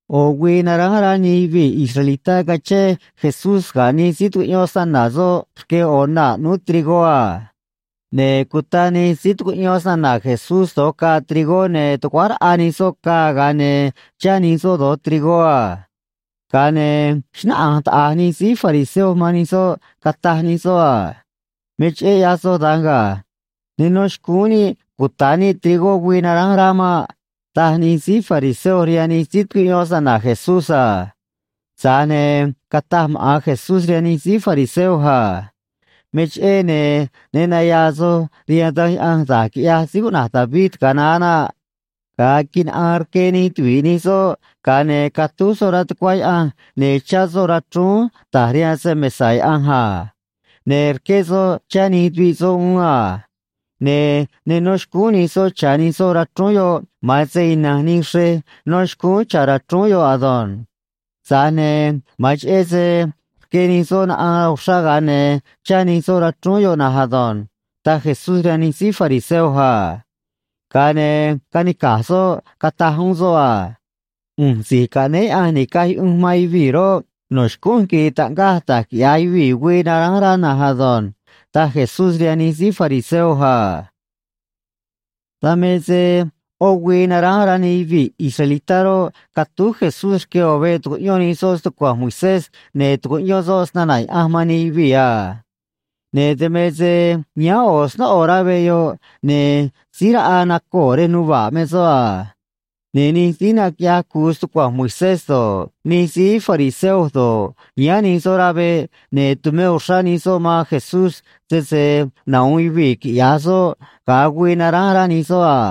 ꞌO̱ güii naránj rá nij yuvii̱ israelitá cachén Jesús ga̱ nij síí tucuꞌyón snana̱ soꞌ rque ꞌo̱ naa̱ ꞌnúú trigó a. Ne̱ cuta nij síí tucuꞌyón snana̱ Jesús do̱j caa trigó, ne̱ tuguáj raꞌa nij soꞌ caa, ga̱a ne̱ chá nij soꞌ do̱j trigó a. Ga̱a ne̱ xnáꞌanj taꞌa̱j nij síí fariseo man nij soꞌ, cataj nij soꞌ a: ―Me cheꞌé ꞌyaj soj da̱nj ga̱. Ne nó xcúún níꞌ cuta̱ níꞌ trigó güii naránj rá maꞌ ―taj nij síí fariseo rihaan nij síí tucuꞌyón snana̱ Jesús a. Tza̱j ne̱ cataj maꞌa̱n Jesús rihaan nij síí fariseo a: ―Me cheꞌé, ne̱ ne naya̱a̱ soj rihaan Danj Yaꞌanj da̱j quiꞌyaj síí cuꞌna̱j David ga̱a naá naꞌ. Ga̱a quinaꞌaan rque nij tuvi̱ꞌ nij soꞌ, ga̱a ne̱ catúj soꞌ rá tucuá Yaꞌanj, ne̱ chá soꞌ rachrúún ta̱j rihaan se‑mesa̱ Yaꞌanj a. Ne̱ rqué soꞌ chá nij tuviꞌ soꞌ uún a. Ne̱ ne nó xcúún nij soꞌ cha̱ nij soꞌ rachrúún yoꞌ, ma̱an se ina̱nj nij xrej nó xcúún cha̱ rachrúún yoꞌ ado̱nj. Tza̱j ne̱ ma̱an cheꞌé se rque nij soꞌ naꞌaan uxrá, ga̱a ne̱ chá nij soꞌ rachrúún yoꞌ na̱nj ado̱nj ―taj Jesús rihaan nij síí fariseo a. Ga̱a ne̱ canica̱j soꞌ, cataj uún soꞌ a: ―ꞌU̱nj Si̱j Caꞌnéé Yaꞌanj Ni̱caj Yuꞌunj man Yuvii̱ roꞌ, no̱ xcúnj quiri̱i̱ taꞌngaj da̱j quiꞌya̱j yuvii̱ güii naránj rá na̱nj ado̱nj ―taj Jesús rihaan nij síí fariseo a. Dan me se ꞌó güii naránj rá nij yuvii̱ israelitá roꞌ, catúj Jesús rque ꞌo̱ veꞌ tucuꞌyón nij soꞌ stucua̱nj Moisés, ne̱ tucuꞌyón soꞌ snana̱ Yaꞌanj man nij yuvii̱ a. Ne̱ dan me se yáán ꞌo̱ snóꞌo rá veꞌ yoꞌ, ne̱ síí raꞌa nacoo̱ rej nuva̱ꞌ me soꞌ a. Ne̱ nij síí naquiꞌyaj cu̱u stucua̱nj Moisés do̱ꞌ, nij síí fariseo do̱ꞌ, yáán nij soꞌ rá veꞌ, ne̱ tumé uxrá nij soꞌ man Jesús sese nahu̱un yuvii̱ quiꞌya̱j soꞌ ga̱a güii naránj rá nij soꞌ a.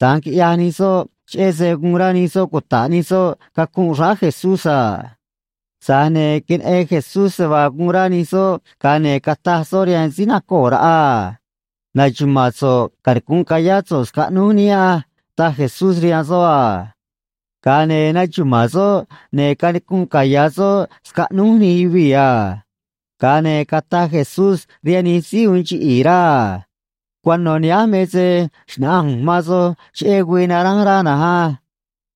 Da̱nj quiꞌyaj nij soꞌ cheꞌé se guun rá nij soꞌ cuta̱ꞌ nij soꞌ cacunꞌ xráá Jesús a. Tza̱j ne̱ queneꞌen Jesús se vaa guun rá nij soꞌ, ga̱a ne̱ cataj soꞌ rihaan síí nacoo̱ raꞌa a: ―Na̱xuma̱a̱n so̱ꞌ canicu̱nꞌ ca̱yá so̱ꞌ scaꞌnúj níꞌ á ―taj Jesús rihaan soꞌ a. Ga̱a ne̱ naxuma̱a̱n soꞌ, ne̱ canicunꞌ caya̱ soꞌ scaꞌnúj nij yuvii̱ a. Ga̱a ne̱ cataj Jesús rihaan nij síí uun chiꞌi̱i̱ rá a: ―Cuano̱ nihánj me se xna̱ꞌanj ꞌu̱nj man soj cheꞌé güii naránj rá na̱nj á.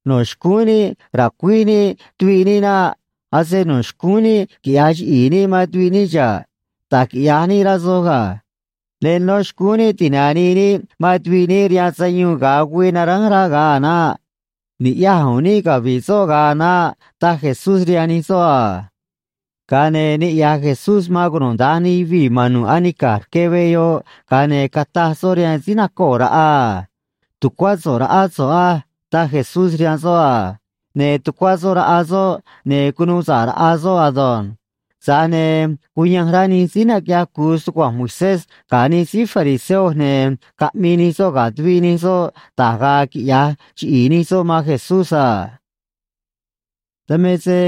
No̱ xcúún níꞌ ra̱cuíj níꞌ tuviꞌ níꞌ naꞌ. Ase no̱ xcúún níꞌ quiꞌya̱j chiꞌi̱i̱ níꞌ man tuviꞌ níꞌ xa̱ꞌ. Da̱j quiꞌya̱j níꞌ rá soj ga̱. Ne nó xcúún níꞌ ti̱nanii níꞌ man tuviꞌ níꞌ rihaan sayuun ga̱a güii naránj rá ga̱a a̱ naꞌ. Ni̱ꞌyaj u̱u̱n níꞌ cavi̱ꞌ soꞌ ga̱a a̱ naꞌ ―taj Jesús rihaan nij soꞌ a. Ga̱a ne̱ niꞌya̱j Jesús man cunuda̱nj nij yuvii̱ ma̱n nu̱ꞌ anica̱j rque veꞌ yoꞌ, ga̱a ne̱ cataj soꞌ rihaan síí nacoo̱ raꞌa a: ―Tu̱cuá so̱ꞌ raꞌá so̱ꞌ á ―taj Jesús rihaan soꞌ a. Ne̱ tucuá soꞌ raꞌa soꞌ, ne̱ cunuu sa̱ꞌ raꞌa soꞌ ado̱nj. Tza̱j ne̱ cuyanj rá nij síí naquiꞌyaj cu̱u stucua̱nj Moisés ga̱ nij síí fariseo, ne̱ caꞌmii nij soꞌ ga̱ tuviꞌ nij soꞌ da̱j ga̱a̱ quiꞌya̱j chiꞌi̱i̱ nij soꞌ man Jesús a. Dan me se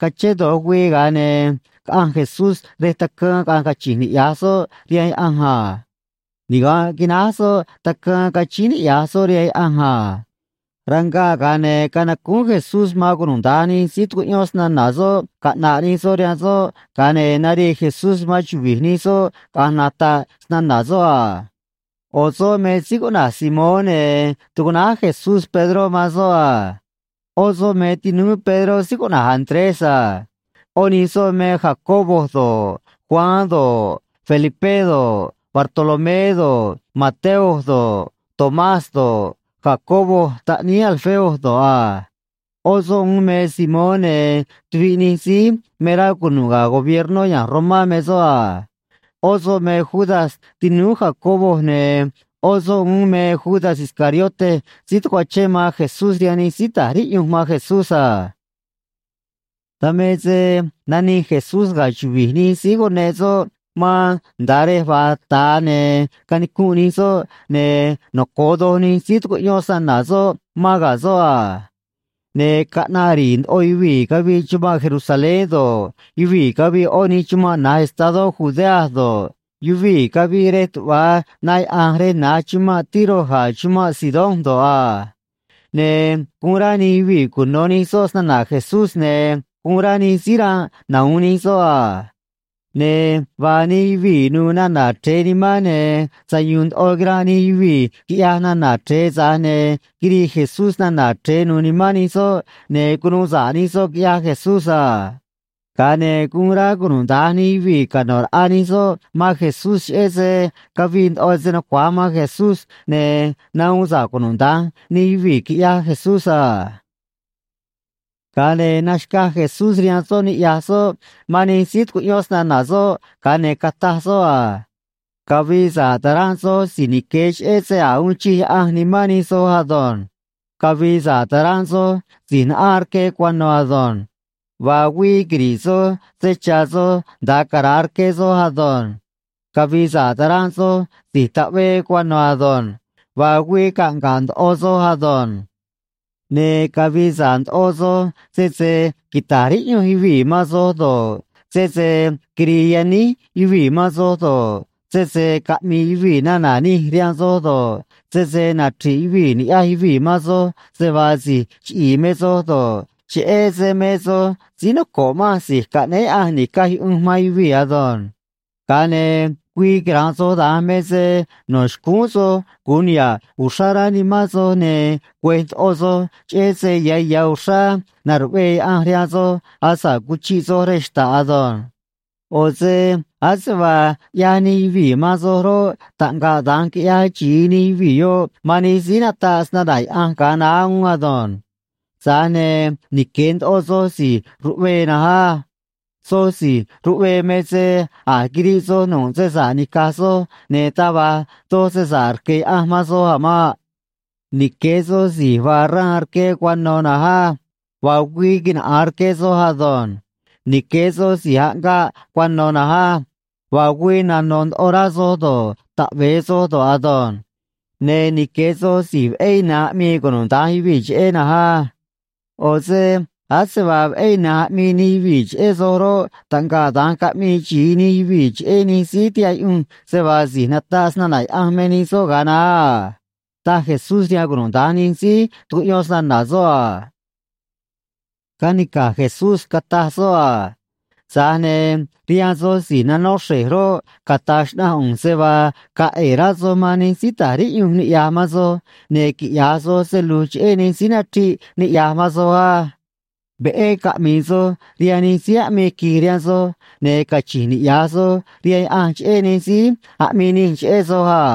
cachén do̱j güii, ga̱a ne̱ caꞌanj Jesús rej tacaan, caꞌanj cachi̱nj niꞌya̱j soꞌ rihaan Yaꞌanj a. Niga̱nꞌ quináj soꞌ tacaan cachíín niꞌya̱j soꞌ rihaan Yaꞌanj a. Rangaꞌ, ga̱a ne̱ canacúún Jesús man cunuda̱nj nij síí tucuꞌyón snana̱ soꞌ caꞌna̱ꞌ nij soꞌ rihaan soꞌ, ga̱a ne̱ narii Jesús man chuvi̱j nij soꞌ caꞌa̱nj nata̱ꞌ snana̱ soꞌ a. ꞌO̱ soꞌ me síí cuꞌna̱j Simón, ne̱ tucuꞌnáj Jesús Pedró man soꞌ a. ꞌÓ soꞌ me tinúú Pedró síí cuꞌna̱j Andrés a. ꞌÓ nij soꞌ me Jacobo do̱ꞌ, Juan do̱ꞌ, Felipé do̱ꞌ, Bartolomé do̱ꞌ, Mateo do̱ꞌ, Tomás do̱ꞌ, Jacobo taꞌníí Alfeo do̱ꞌ a. ꞌÓ soꞌ uún me Simón, ne̱ tuviꞌ nij síí me rá cunu̱ꞌ ga̱ gobiernó ya̱nj Romá me soꞌ a. ꞌÓ soꞌ me Judas tinúú Jacobo, ne̱ ꞌó soꞌ uún me Judas Iscariote síí tacuachén man Jesús rihaan nij síí ta̱j riꞌyunj man Jesús a. Dan me se nanij Jesús ga̱ chuvi̱j nij síí cuneꞌ soꞌ man nda̱a rej vaa ta̱a ne̱ canicunꞌ nij soꞌ, ne̱ noco̱o doj nij síí tucuꞌyón snana̱ soꞌ mán ga̱ soꞌ a. Ne̱ caꞌnaꞌ ri̱i̱ ndoꞌo yuvii̱ cavii chumanꞌ Jerusalén do̱ꞌ, yuvii̱ cavii ꞌó nij chumanꞌ na̱j estadó Judea do̱ꞌ, yuvii̱ cavii rej tuꞌva na yaꞌa̱nj rej na̱j chumanꞌ Tiro ga̱ chumanꞌ Sidón do̱ꞌ a. Ne̱ guun rá nij yuvii̱ cuno̱ nij soꞌ snana̱ Jesús, ne̱ guun rá nij síí ranꞌ nahu̱un nij soꞌ a. Ne̱ vaa nij yuvii̱ nu̱u̱ nana̱ chre̱e nimán, ne̱ sayu̱u̱n ndoꞌo quiranꞌ nij yuvii̱, quiꞌyaj nana̱ chre̱e, tza̱j ne̱ quirii Jesús nana̱ chre̱e nu̱u̱ nimán nij soꞌ, ne̱ cunuu sa̱ꞌ nij soꞌ, quiꞌyaj Jesús a. Ga̱a ne̱ guun rá cunuda̱nj nij yuvii̱ cano̱ raꞌa nij soꞌ man Jesús cheꞌé se cavii ndoꞌo se nucua̱j man Jesús, ne̱ nahuun sa̱ꞌ cunuda̱nj nij yuvii̱, quiꞌyaj Jesús a. Ga̱a ne̱ naxca̱j Jesús rihaan soꞌ niꞌya̱j soꞌ man nij síí tucuꞌyón snana̱ soꞌ, ga̱a ne̱ cataj soꞌ a: ―Cavi̱i̱ sa̱ꞌ ta̱ranꞌ soj si̱j nique̱ cheꞌé se a̱j uun chij Yaꞌanj nimán nij soꞌ ado̱nj. ’Cavi̱i̱ sa̱ꞌ ta̱ranꞌ soj si̱j naꞌaan rque cuano̱ ado̱nj. Vaa güii quiri̱ꞌ soj se cha̱ soj nda̱a cara̱a rque soj ado̱nj. ’Cavi̱i̱ sa̱ꞌ ta̱ranꞌ soj si̱j taꞌvee cuano̱ ado̱nj. Vaa güii caꞌnga̱ꞌ ndoꞌo soj ado̱nj. ’Ne̱ cavi̱i̱ sa̱ꞌ ndoꞌo soj sese quita̱j riꞌyunj yuvii̱ man soj do̱ꞌ, sese quiri̱i̱ yaníj yuvii̱ man soj do̱ꞌ, sese caꞌmi̱i̱ yuvii̱ nana̱ nij rihaan soj do̱ꞌ, sese nachri̱ꞌ yuvii̱ ni̱ꞌyaj yuvii̱ man soj se vaa si̱j chiꞌi̱i̱ me soj do̱ꞌ, cheꞌé se me soj síí noco̱ꞌ manj Si̱j Caꞌnéé Yaꞌanj Ni̱caj Yuꞌunj man Yuvii̱ ado̱nj. Ga̱a ne̱ güii quira̱nꞌ soj da̱nj me se no̱ xcúún soj gu̱un niha̱ꞌ uxrá rá nimán soj ne̱ güe̱j ndoꞌo soj, cheꞌé se ya̱ ya̱ uxrá na̱ruꞌvee Yaꞌanj rihaan soj asa̱ꞌ cuchiꞌ soj rej xta̱ꞌ ado̱nj. ꞌO̱ se ase vaa ꞌyaj nij yuvii̱ man soj roꞌ, taꞌngaꞌ da̱nj quiꞌyaj xi̱i nij yuvii̱ yoꞌ man nij síí nataꞌ snana̱ Yaꞌanj ga̱a naá uún ado̱nj. ’Tza̱j ne̱ nique̱ ndoꞌo soj si̱j ruꞌvee na̱nj á. Soj si̱j ruꞌvee me se a̱j quiriꞌ soj nu̱ꞌ se sa̱ꞌ ni̱caj soj, ne̱ taj va̱j doj se sa̱ꞌ rque̱ Yaꞌanj man soj a̱ maꞌ. ’Nique̱ soj si̱j vaa xraan rque cuano̱ na̱nj á. Vaa güii quinaꞌa̱an rque soj ado̱nj. ’Nique̱ soj si̱j aꞌngaꞌ cuano̱ na̱nj á. Vaa güii nano̱ ndoꞌo rá soj do̱ꞌ, taꞌve̱e soj do̱ꞌ ado̱nj. ’Ne̱ nique̱ soj si̱j veꞌé ina̱nj aꞌmii cunuda̱nj yuvii̱ cheꞌé na̱nj á. ꞌO̱ se ase vaa veꞌé ina̱nj aꞌmii nij yuvii̱ cheꞌé soj roꞌ, taꞌngaꞌ da̱nj caꞌmii xi̱i nij yuvii̱ cheꞌé nij síí tihaꞌ yuꞌunj se vaa si̱j nataꞌ snana̱ Yaꞌanj me nij soꞌ ga̱a naá a ―taj Jesús rihaan cunuda̱nj nij síí tucuꞌyón snana̱ soꞌ a. Canica̱j Jesús, cataj soꞌ a: ―Tza̱j ne̱ rihaan soj si̱j nanó xre̱j roꞌ, cata̱j xnaꞌanj ꞌu̱nj se vaa ga̱a̱ ꞌe̱e̱ rá soj man nij síí ta̱j riꞌyunj niꞌya̱j man soj, ne̱ quiꞌya̱j soj se lu̱j cheꞌé nij síí nachriꞌ niꞌya̱j man soj á. Veꞌé caꞌmi̱i̱ soj rihaan nij síí aꞌmii qui̱j rihaan soj, ne̱ cachi̱nj niꞌya̱j soj rihaan Yaꞌanj cheꞌé nij síí aꞌmii nij cheꞌé soj a.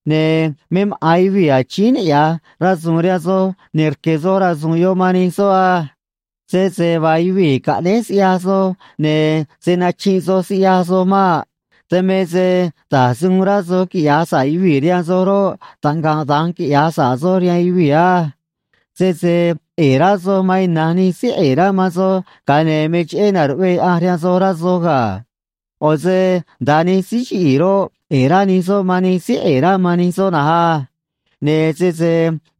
Ne̱ me maꞌa̱n yuvii̱ achíín niꞌya̱j rasu̱u̱n rihaan soj, ne̱ rque̱ soj rasu̱u̱n yoꞌ man nij soꞌ á. Sese vaa yuvii̱ caꞌnéj siꞌyaj soj, ne̱ se̱ nachinꞌ soj siꞌyaj soj maꞌ. Dan me se da̱j se uun rá soj quiꞌya̱j sa̱ꞌ yuvii̱ rihaan soj roꞌ, taꞌngaꞌ da̱nj quiꞌya̱j sa̱ꞌ soj rihaan yuvii̱ á. ’Sese ꞌe̱e̱ rá soj man ina̱nj nij síí ꞌe̱e̱ rá man soj, ga̱a ne̱ me cheꞌé na̱ruꞌvee Yaꞌanj rihaan soj, rá soj ga̱. ꞌO̱ se nda̱a nij síí chiꞌi̱i̱ roꞌ, ꞌe̱e̱ rá nij soꞌ man nij síí ꞌe̱e̱ rá man nij soꞌ na̱nj á. Ne̱ sese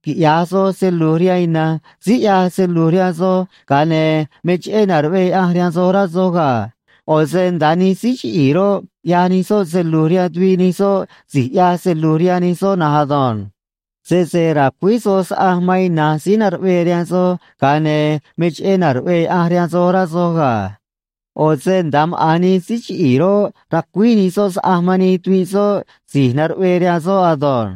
quiꞌya̱j soj se lu̱j rihaan ina̱nj síí ꞌyaj se lu̱j rihaan soj, ga̱a ne̱ me cheꞌé na̱ruꞌvee Yaꞌanj rihaan soj, rá soj ga̱. ꞌO̱ se nda̱a nij síí chiꞌi̱i̱ roꞌ, ꞌyaj nij soꞌ se lu̱j rihaan tuviꞌ nij soꞌ si̱j ꞌyaj se lu̱j rihaan nij soꞌ na̱nj ado̱nj. Sese ra̱cuíj soj saꞌanj man ina̱nj síí na̱ruꞌvee rihaan soj, ga̱a ne̱ me cheꞌé na̱ruꞌvee Yaꞌanj rihaan soj, rá soj ga̱. ꞌO̱ se nda̱a maꞌa̱n nij síí chiꞌi̱i̱ roꞌ, racuíj nij soꞌ saꞌanj man nij tuviꞌ soꞌ si̱j na̱ruꞌvee rihaan soꞌ ado̱nj.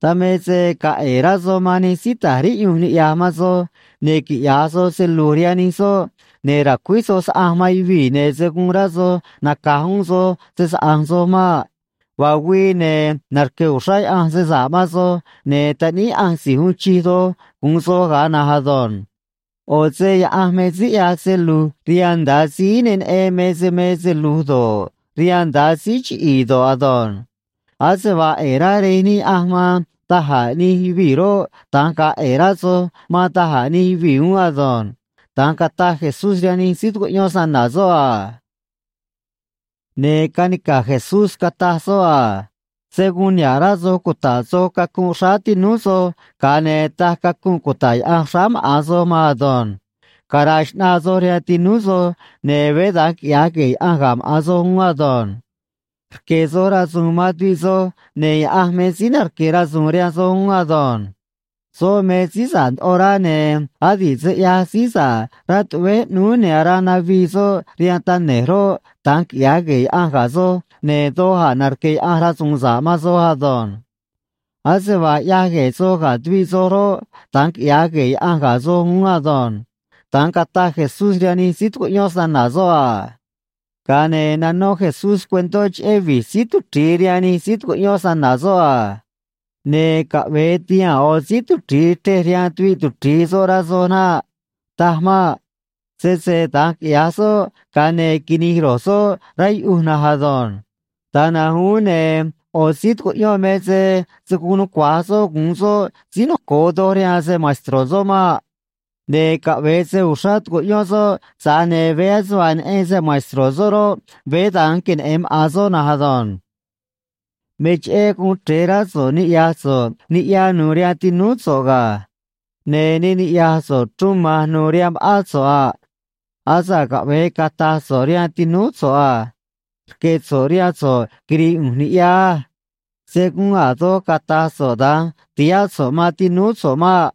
’Dan me se ga̱a̱ ꞌe̱e̱ rá soj man nij síí ta̱j riꞌyunj niꞌya̱j man soj, ne̱ quiꞌya̱j soj se lu̱j rihaan nij soꞌ, ne̱ ra̱cuíj soj saꞌanj man yuvii̱, ne̱ se̱ guun rá soj naca̱j uún soj se‑saꞌa̱nj soj maꞌ. Vaa güii, ne̱ narque̱ uxrá Yaꞌanj se sa̱ꞌ man soj, ne̱ taꞌníí Yaꞌanj Si̱j Uun Chij Doj gu̱un soj ga̱a na̱nj ado̱nj. ꞌO̱ se Yaꞌanj me síí ꞌyaj se lu̱j rihaan nda̱a síí ne neꞌen me se me se lu̱j do̱ꞌ, rihaan nda̱a síí chiꞌi̱i̱ do̱ꞌ ado̱nj. Ase vaa ꞌe̱e̱ rá Rej níꞌ Yaꞌanj man da̱j a̱ nij yuvii̱ roꞌ, da̱nj ga̱a̱ ꞌe̱e̱ rá soj man da̱j a̱ nij yuvii̱ uún ado̱nj ―da̱nj cataj Jesús rihaan nij síí tucuꞌyón snana̱ soꞌ a. Ne̱ canica̱j Jesús cataj soꞌ a: ―Se̱ guun niha̱ꞌ rá soj cuta̱ꞌ soj cacunꞌ xráá tinúú soj, ga̱a ne̱ taj cacunꞌ cuta̱ꞌ Yaꞌanj xráá maꞌa̱n soj maan ado̱nj. Cara̱a̱ xꞌnaa soj rihaan tinúú soj, ne̱ veé da̱nj quiꞌya̱j gue̱e̱ Yaꞌanj ga̱ maꞌa̱n soj uún ado̱nj. Rque̱ soj rasu̱u̱n man tuviꞌ soj, ne̱ Yaꞌanj me síí narque̱ rasu̱u̱n rihaan soj uún ado̱nj. Soꞌ me síí sa̱ꞌ ndoꞌo rá, ne̱ adi̱ꞌ se ꞌyaj síí sa̱ꞌ rá tuꞌvéj ꞌnúú ne̱ araa navii soꞌ rihaan tane̱j roꞌ, da̱nj quiꞌya̱j gue̱e̱ Yaꞌanj ga̱ soj, ne̱ doj a̱ narque̱ Yaꞌanj rasu̱u̱n sa̱ꞌ man soj ado̱nj. Ase vaa ꞌyaj gue̱e̱ soj ga̱ tuviꞌ soj roꞌ, da̱nj quiꞌya̱j gue̱e̱ Yaꞌanj ga̱ soj uún ado̱nj ―da̱nj cataj Jesús rihaan nij síí tucuꞌyón snana̱ soꞌ a. Ga̱a ne̱ nanó Jesús cuentó cheꞌé vi̱j síí tuchri̱i rihaan nij síí tucuꞌyón snana̱ soꞌ a: ―Ne̱ caꞌve̱e ti̱haa̱n ꞌo̱ síí tuchri̱i chrej rihaan tuviꞌ tuchri̱i soꞌ, rá soj naꞌ. Taj maꞌ. Sese da̱nj quiꞌya̱j soꞌ, ga̱a ne̱ quini̱j ro̱j soꞌ rá yuꞌuj na̱nj ado̱nj. Da̱nj na̱nj uún, ne̱ ꞌo̱ síí tucuꞌyón me se se̱ guun nucua̱j soꞌ gu̱un soꞌ síí noco̱o doj rihaan se‑maestro̱ soꞌ maꞌ. Ne̱ caꞌve̱e se uxrá tu̱cuꞌyón soꞌ, tza̱j ne̱ veé ase vaa neꞌen se‑maestro̱ soꞌ roꞌ, veé da̱nj queneꞌe̱n maꞌa̱n soꞌ na̱nj ado̱nj. ’Me cheꞌé guun chre̱e rá so̱ꞌ niꞌya̱j so̱ꞌ niꞌya nu̱u̱ rihaan tinúú so̱ꞌ ga̱. Ne̱ ne niꞌya̱j so̱ꞌ chruun ma̱nj nu̱u̱ rihaan ma̱ꞌán so̱ꞌ a. Asa̱ꞌ caꞌve̱e cata̱j so̱ꞌ rihaan tinúú so̱ꞌ a: “Rque̱ so̱ꞌ rihaan so̱ꞌ quiri̱i̱ ꞌu̱nj niꞌya á.” Se̱ guun a̱ doj cata̱j so̱ꞌ da̱nj ti̱háꞌ so̱ꞌ man tinúú so̱ꞌ maꞌ.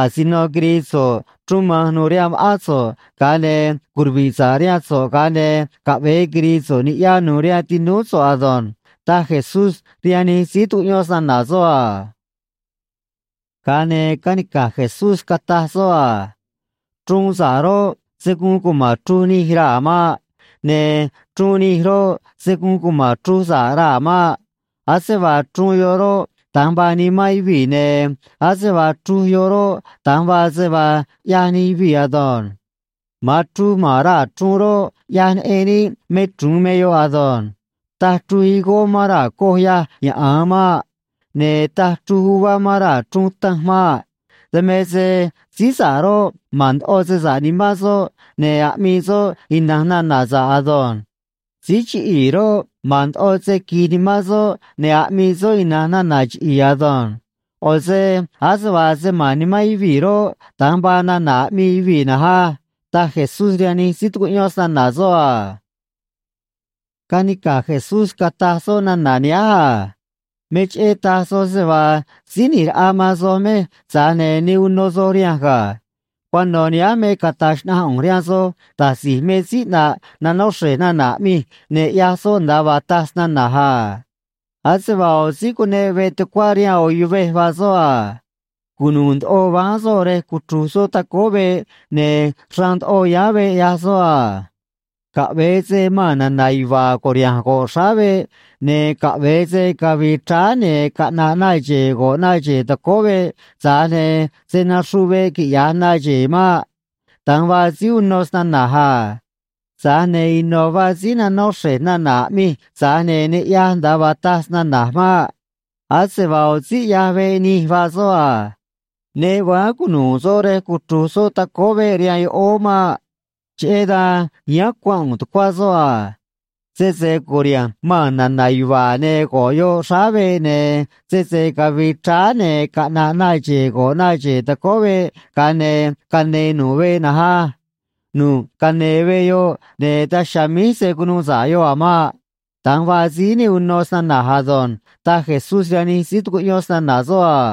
Asino quiri̱i̱ so̱ꞌ chruun ma̱nj nu̱u̱ rihaan ma̱ꞌán so̱ꞌ, ga̱a ne̱ curuvi̱ꞌ sa̱ꞌ rihaan so̱ꞌ, ga̱a ne̱ caꞌve̱e quiri̱i̱ so̱ꞌ niꞌya nu̱u̱ rihaan tinúú so̱ꞌ ado̱nj ―taj Jesús rihaan nij síí tucuꞌyón snana̱ soꞌ a. Ga̱a ne̱ canica̱j Jesús, cataj soꞌ a: ―Chruun sa̱ꞌ roꞌ, se̱ guun cuma̱n chruj nij raa̱ maꞌ. Ne̱ chruun nij roꞌ, se̱ guun cuma̱n chruj sa̱ꞌ raa̱ maꞌ. Ase vaa chruun yoꞌ roꞌ, da̱nj vaa nimán yuvii̱, ne̱ ase vaa chruj yoꞌ roꞌ, da̱nj vaa se vaa ꞌyaj nij yuvii̱ ado̱nj. Ma̱an chruj ma̱n raa̱ chruun roꞌ, ꞌyaj neꞌen níꞌ me chru̱un me yoꞌ ado̱nj. Taj chruj higó mán raa̱ coj yâj yaꞌa̱a maꞌ. Ne̱ taj chruj uvá mán raa̱ chruun tanj maꞌ. Dan me se síí sa̱ꞌ roꞌ, ma̱n ndoꞌo se sa̱ꞌ nimán soꞌ, ne̱ aꞌmii soꞌ ina̱nj nana̱ sa̱ꞌ ado̱nj. Síí chiꞌi̱i̱ roꞌ, ma̱n ndoꞌo se qui̱j nimán soꞌ, ne̱ aꞌmii soꞌ ina̱nj nana̱ chiꞌi̱i̱ ado̱nj. ꞌO̱ se ase vaa se ma̱n nimán yuvii̱ roꞌ, da̱nj vaa nana̱ aꞌmii yuvii̱ na̱nj á ―taj Jesús rihaan nij síí tucuꞌyón snana̱ soꞌ a. Canica̱j Jesús, cataj soꞌ nana̱ nihánj a: ―Me cheꞌé taj soj se vaa Síí ꞌNi̱j Raꞌa man soj mej, tza̱j ne̱ ne uno soj rihanj ga̱. Cuano̱ nihánj me cata̱j xnaꞌanj ꞌu̱nj rihaan soj da̱j si̱j me síí ꞌnaꞌ nanó xre̱j nana̱ aꞌmij, ne̱ ꞌyaj soꞌ nda̱a vaa taj snana̱j a. Ase vaa ꞌo̱ síí cuneꞌ veꞌ tucuá rihaan ꞌo̱ yuvej vaa soꞌ a. Cunu̱u̱ ndoꞌo váán soꞌ rej cuchru̱j soꞌ tacóó veꞌ, ne̱ xraan ndoꞌo yáán veꞌ, ꞌyaj soꞌ a. Caꞌve̱e se maa̱n na̱na̱ yuva̱a̱ cu̱riha̱nj go̱ꞌ xráá veꞌ, ne̱ caꞌve̱e se cavi̱i̱ chráá, ne̱ caꞌna̱ꞌ na xe̱e̱ go̱ꞌ na xe̱e̱ tacóó veꞌ, tza̱j ne̱ se̱ naxruꞌ veꞌ, quiꞌya̱j na xe̱e̱ maꞌ. Da̱nj vaa síí uno snana̱j a. Tza̱j ne̱ ino̱ vaa síí nanó xre̱j nana̱ aꞌmij tza̱j ne̱ ne ꞌyaj nda̱a vaa taj snana̱j maꞌ. Ase vaa ꞌo̱ síí ꞌyaj veꞌ nij vaa soꞌ a. Ne váán cunu̱u̱ soꞌ rej cuchru̱j soꞌ tacóó veꞌ rihaan yoꞌóó maꞌ. Cheꞌé dan yáán cuanꞌ u̱u̱n tucuá soꞌ a. Sese cu̱riha̱nj maa̱n na̱na̱ yuva̱a̱, ne̱ go̱ꞌ yoꞌ xráá veꞌ, ne̱ sese cavi̱i̱ chráá, ne̱ caꞌna̱ꞌ na xe̱e̱ go̱ꞌ na xe̱e̱ tacóó veꞌ, ga̱a ne̱ cane̱e̱ nu̱ꞌ veꞌ na̱nj á. Nu̱ꞌ cane̱e̱ veꞌ yoꞌ, ne̱ daj chiha̱a̱ míj se̱ cunuu sa̱ꞌ yoꞌ a̱ maꞌ. Da̱nj vaa síí ne uno snana̱j ado̱nj ―taj Jesús rihaan nij síí tucuꞌyón snana̱ soꞌ a.